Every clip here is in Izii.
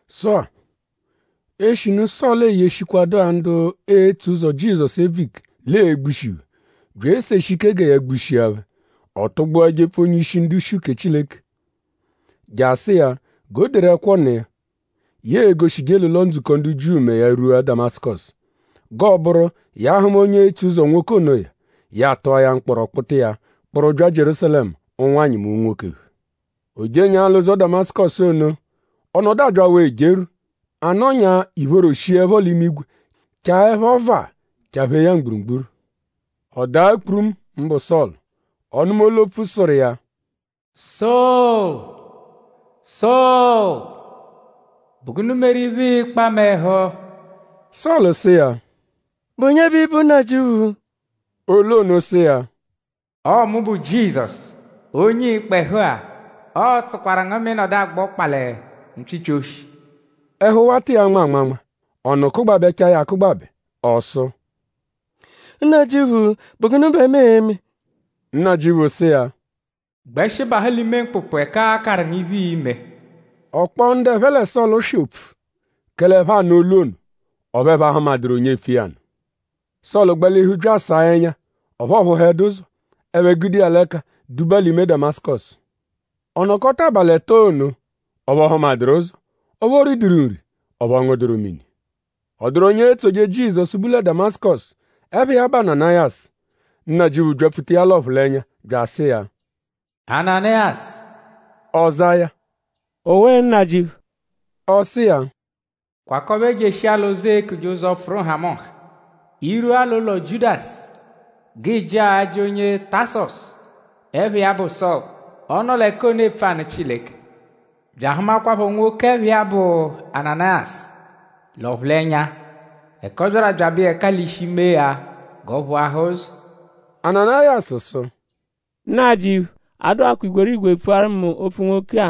Sụ-a; eshinu Sọlu eyeshikwadụa ndu etso ụzo Jizọsu ebvu ike l'ee-gbushi phẹ; bya eseshi ike gẹ ya gbushia phẹ; ọ tụgbua jepfu onye-ishi ndu-ishi uke Chileke je asụ iya g'o deru ẹkwo nụ iya, ya e-goshije l'ụlo-ndzukọ ndu Jiu mẹ ya -rwua Damasụkosu; g'ọo-bụru ya -hụma onye etso ụzo nwoke onoya; ya atụa ya mkpọro kpụta iya kpụru bya Jierúsalẹmu; ụnwanyi mẹ unwoke phẹ. O jenyaa l'ụzo Damasụkosu ono; ọ nọdu abyawaa ejerwu. A nọnya ìphóró shiẹpho l'imigwe chaẹpho vaa chaphee ya mgburugburu. Ọ daa kpurumu mbụ Sọlu. Ọ nụma olu-opfu, sụru iya: “Sọlu! Sọlu!?Bụ gụnu meru iphe, ịikpa mu ẹhu?” Sọlu sụ iya: “?Bụ onye bẹ ị bụ Nnajịuphu?” Olu ono sụ iya: Ọo mu bụ Jizọsu; onye ịikpa ẹhu-a. Ọo-tsụkwaru ngu mẹ ị nọdu agba ọkpa lẹ mpyịpyi-oshi. Ẹhu wata iya anma anmanma. Ọnu kụgbabechaa ya akụgbabe. Ọ sụ: “Nnajịuphu;?bụ gụnu bẹ mu e-me.” Nnajịuphu sụ iya: “Gbẹshi bahụ l'ime mkpụkpu ẹka aa-karụ ngu iphe, ii-me.” Ọ kpọo ndu ẹphe lẹ Sọlu swị opfu; kẹle ẹphe anụ olu ono; ọphu ẹphe ahụmaduru onye epfu iya nụ. Sọlu gbalihu bya asaa ẹnya; ọphu ọ phụhedu ụzo. Ẹphe gude iya l'ẹka duba l'ime Damasụkosu. Ọ nọkota abalị ẹto ono; ọphu ọ hụmaduru ụzo; ọphu o riduru nri; ọphu ọ ngụduru mini. Ọ dụru onye etsoje Jizọsu, bu lẹ Damasụkosu, ẹpha iya bụ Ananayasu. Nnajịuphu byapfuta iya l'ọphulenya bya asụ iya: “Ananayasu!” Ọ za iya: “Owe Nnajịuphu!” Ọ sụ iya: “Kwakọbe jeshia l'ụzo, eekuje Ụzo-pfụru-nhamụnha. I -rwua l'ụlo Jiudasu; g'ị jịa ajị onye Tasọsu, ẹpha iya bụ Sọlu. Ọ nọ l'ẹka ono epfu anụ Chileke; bya ahụmakwapho nwoke, ẹpha iya bụ Ananayasu l'ọphulenya ẹka ọ byaru abyabẹ iya ẹka l'ishi mee ya g'ọ phụahaa ụzo.” Ananayasu sụ: “Nnajịuphu! A dụakwaa igwerigwe pfuaru mu opfu nwoke-a;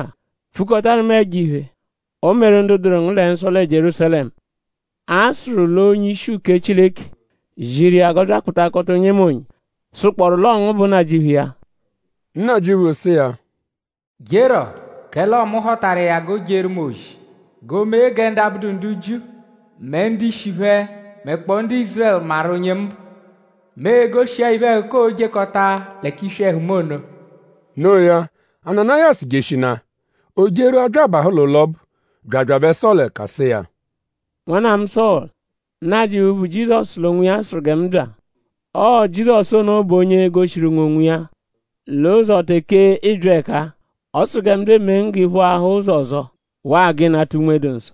pfukọtaru mu ẹjo-iphe, o meru ndu dụru ngu nsọ lẹ Jierúsalẹmu. A sụru l'onye-ishi uke Chileke ziru iya g'ọ bya akpụtakota onyemonye, sụkpooru l'ọo ngu bụ Nnajịuphu iya.” Nnajịuphu sụ iya: “Jerọ! Kẹle ọo mu họtaru iya g'o jeeru mu ozi; g'oomee gẹ ndu abụdu ndu Jiu mẹ ndu-ishi phẹ mẹkpoo ndu Ízurẹlu maru onye mu bụ. Mu e-goshi iya iphe-ẹhuka, oo-jekọta lẹ k'iswi ẹhu mu ono.” Noo ya; Ananayasu jeshinaa. O jerwua bya abahụ l'ụlo ọbu; bya abyabẹ Sọlu ẹka sụ iya: “Nwanna mu Sọlu! Nnajịuphu, bụ Jizọsu l'onwiya sụru gẹ mu bya. Ọo Jizọsu ono bụ onye goshiru ngu onwiya l'ụzo teke ịibya ẹka-a. Ọ sụru gẹ mu bya emee ngu g'ị phụahaa ụzo ọzo; waa g'ị nata Unme-dụ-Nsọ.”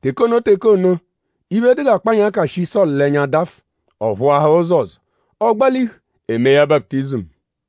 Teke ono teke ono; iphe, dụ g'akpanyaka shi Sọlu l'ẹnya dafụ; ọ phụahaa ụzo ọzo. Ọ gbalihu; e mee ya baputizimu.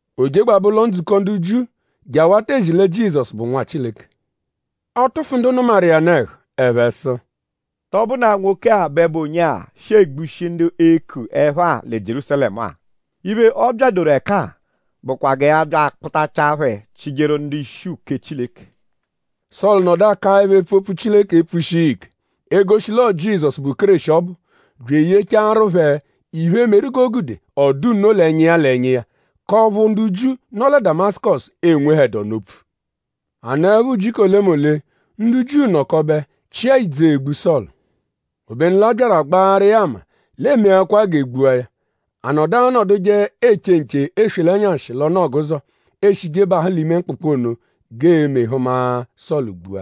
O jegbabẹ ụlo-ndzukọ ndu Jiu je awata ezi lẹ Jizọsu bụ Nwa Chileke. Ọ tụfu ndu nụmaru iya nụ ẹhu. Ẹphe sụ: “?Tọ bụnaa nwoke-a bẹ bụ onye-a, shi egbushi ndu eeku ẹpha-a lẹ Jierúsalẹmu-a? Iphe, ọ byadoru ẹka-a bụkwa gẹ ya bya akpụtachaa phẹ chịjeru ndu-ishi uke Chileke.” Sọlu nọdu akaẹpho epfu opfu Chileke epfushi iya ike; egoshi l'ọo Jizọsu, bụ Kéreshi ọbu; bya eyechaaru phẹ iphe, meru g'o gude ọ dụ nno l'ẹnya iya l'ẹnya iya k'ọphu ndu Jiu, nọ lẹ Damasụkosu enwehẹdu ọnu opfu. A nọepho ujiku olemole; ndu Jiu nọkobe chịa ìdzù egbu Sọlu. Obenu l'a byaru agbaarụ iya ama l'eemeakwaa g'e gbua ya. A nọdu anọduje eche nche eswe l'ẹnyashi l'ọnu-ọguzo, eeshije bahụ l'ime mkpụkpu ono g'eeme hụma Sọlu gbua.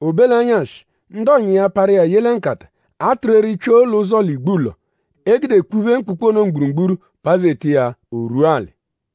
O be l'ẹnyashi; ndu ọ̀nyà iya parụ iya ye lẹ nkata, a tụru eri pyoo l'ụzo l'igbulọ, e gude kpụphe mkpụkpu ono mgburugburu pazeta iya; o rwua alị.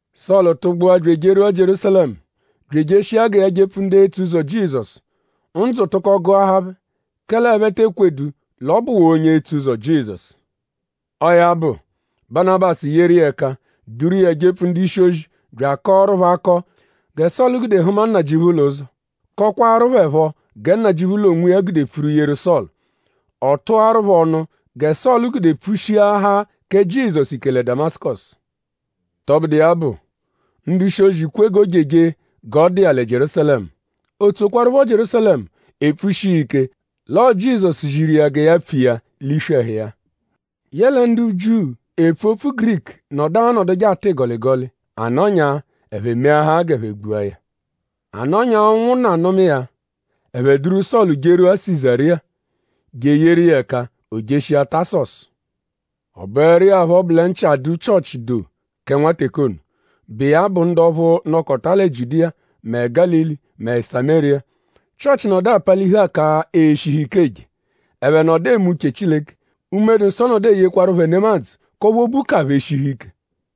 Sọlu tụgbua bya ejerwua Jierúsalẹmu bya ejeshia gẹ ya jepfu ndu etso ụzo Jizọsu. Ndzụ tụko gụahaa phẹ; kẹle ẹphe te ekwedu l'ọ bụwaa onye etso ụzo Jizọsu. Ọo ya bụ; Banabasu yeru iya ẹka duru iya jepfu ndu-ishi-ozi bya akọoru phẹ akọ gẹ Sọlu gude hụma Nnajịuphu l'ụzo; kọkwaaru phẹ phọ gẹ Nnajịuphu l'onwiya gude pfuru yeru Sọlu. Ọ tụaru phẹ ọnu gẹ Sọlu gude pfushiahaa kẹ Jizọsu ike lẹ Damasụkosu. Tọbudu iya bụ; ndu-ishi-ozi kwe g'o jeje g'ọ dụ iya lẹ Jierúsalẹmu. O tsokwarụpho Jierúsalẹmu epfushi iya ike l'ọo Jizọsu ziru iya gẹ ya pfu iya l'iswi ẹhu iya. Yẹle ndu Jiu, epfu opfu Giriku nọdu anọduje atụ ịgoligoli. A nọnyaa; ẹphe meahaa g'ẹphe gbua ya. A nọnyaa ụnwunna nụma iya; ẹphe duru Sọlu jerwua Sizariya; je eyeru iya ẹka o jeshia Tasọsu. Ọ bụeru iya phọ bụ lẹ nchị adụ Chịochi doo kẹ nwa teke ono, bụ iya bụ ndu ọphu nọkota lẹ Jiudiya mẹ Gálili mẹ Samériya. Chịochi nọdu apalihu aka eshihu ike eje. Ẹphe nọdu eme uche Chileke. Unme-dụ-Nsọ nọdu eyekwaru phẹ nemadzụ k'ọphu obu ka phẹ eshihu ike.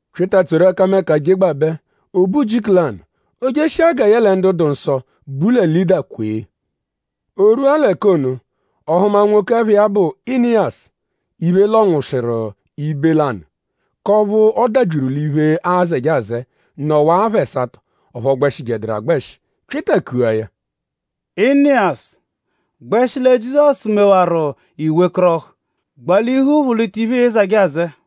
Pyịta tsoru ẹkameka jegbabẹ. O be ujiku lanụ; o jeshia gẹ yẹle ndu dụ nsọ, bu lẹ Lịda kwee. O rwua l'ẹka ono; ọ hụma nwoke, ẹpha iya bụ Iniyasu, iphe lọnwushiru ibe lanụ k'ọphu ọ dabyiru l'iphe, aazẹje azẹe nọwaa apha ẹsato; ọphu ọ gbẹshijeduru agbẹshi. Pyịta kua ya: “Iniyasu! Gbẹshi lẹ Jizọsu mewaru; i wekọrohu. Gbalihu phụ-lita iphe, ịi zẹje azẹe.”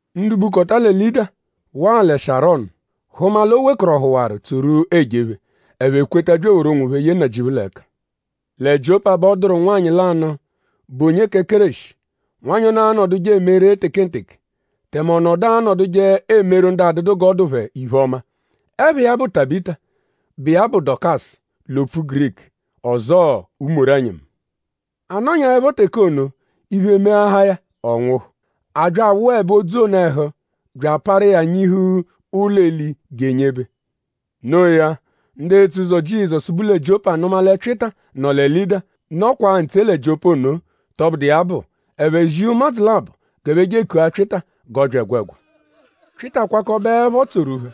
Ndu bukọta lẹ Lịda waa lẹ Sharọnu hụma l'o wekọrohuwaru tsoru ejephe; ẹphe kweta bya eworu onwophẹ yee Nnajịuphu l'ẹka. Lẹ Jiọpa bẹ ọ dụru nwanyị lanụ, bụ onye kẹ Kéreshi. Nwanyị ono anọduje eme ree tekenteke; tẹme ọ nọdu anọduje emeru ndu adụdu g'ọ dụ phẹ iphe-ọma. Ẹpha iya bụ Tabịta, bụ iya bụ Dokasu l'opfu Giriku; ọzoo umoro-ẹnyimu. A nọnyaepho teke ono; iphe meahaa ya. Ọ nwụhu. A bya awụebe odzu ono ẹhu bya aparu iya nyihu ụlo-eli je enyebe. Noo ya; ndu etso ụzo Jizọsu, bu lẹ Jiọpa nụma lẹ Pyịta nọ lẹ Lịda, nọkwaa ntse lẹ Jiọpa ono. Tọbudu iya bụ; ẹphe zia ụmadzu labọ g'ẹphe je ekua Pyịta g'ọ bya ẹgwegwa. Pyịta kwakọbeepho tsoru phẹ.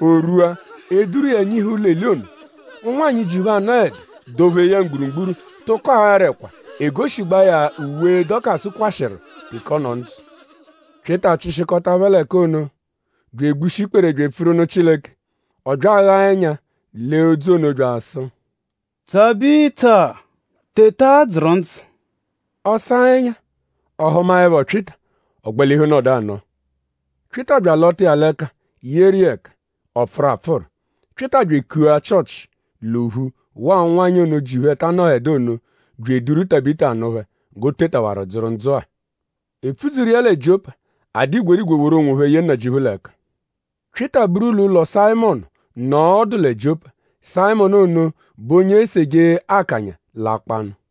O rwua; e duru iya nyihu ụlo-eli ono. Ụnwanyi, ji phẹ anọedu dọ-phee ya mgburugburu tụko aara ẹkwa egoshigbaa ya uwe, Dokasu kwashịru teke ọ nọ ndzụ. Pyịta chịshikota phẹ l'ẹka ono bya egbushi ikpere bya epfuru nụ Chileke. Ọ bya aghaa ẹnya lee odzu ono bya asụ: “Tabịta! Teta dzụru ndzụ!” Ọ saa ẹnya. Ọ hụmaepho Pyịta; ọ gbalihu nọdu anọo. Pyịta bya alọta iya l'ẹka yeru iya ẹka; ọ pfụru apfụru. Pyịta bya ekua Chịochi l'ophu waa ụnwanyi ono, ji phẹ ta anọedu ono; bya eduru Tabịta nụ phẹ g'o tetawaru dzụru ndzụ-a. E pfudzuru iya lẹ Jiọpa. A dụ igwerigwe woru onwophẹ ye Nnajịuphu l'ẹka. Pyịta buru l'ụlo Sayịmonu nọo ọdu lẹ Jiọpa. Sayịmonu ono bụ onye eseje akanya l'akpọ-anụ.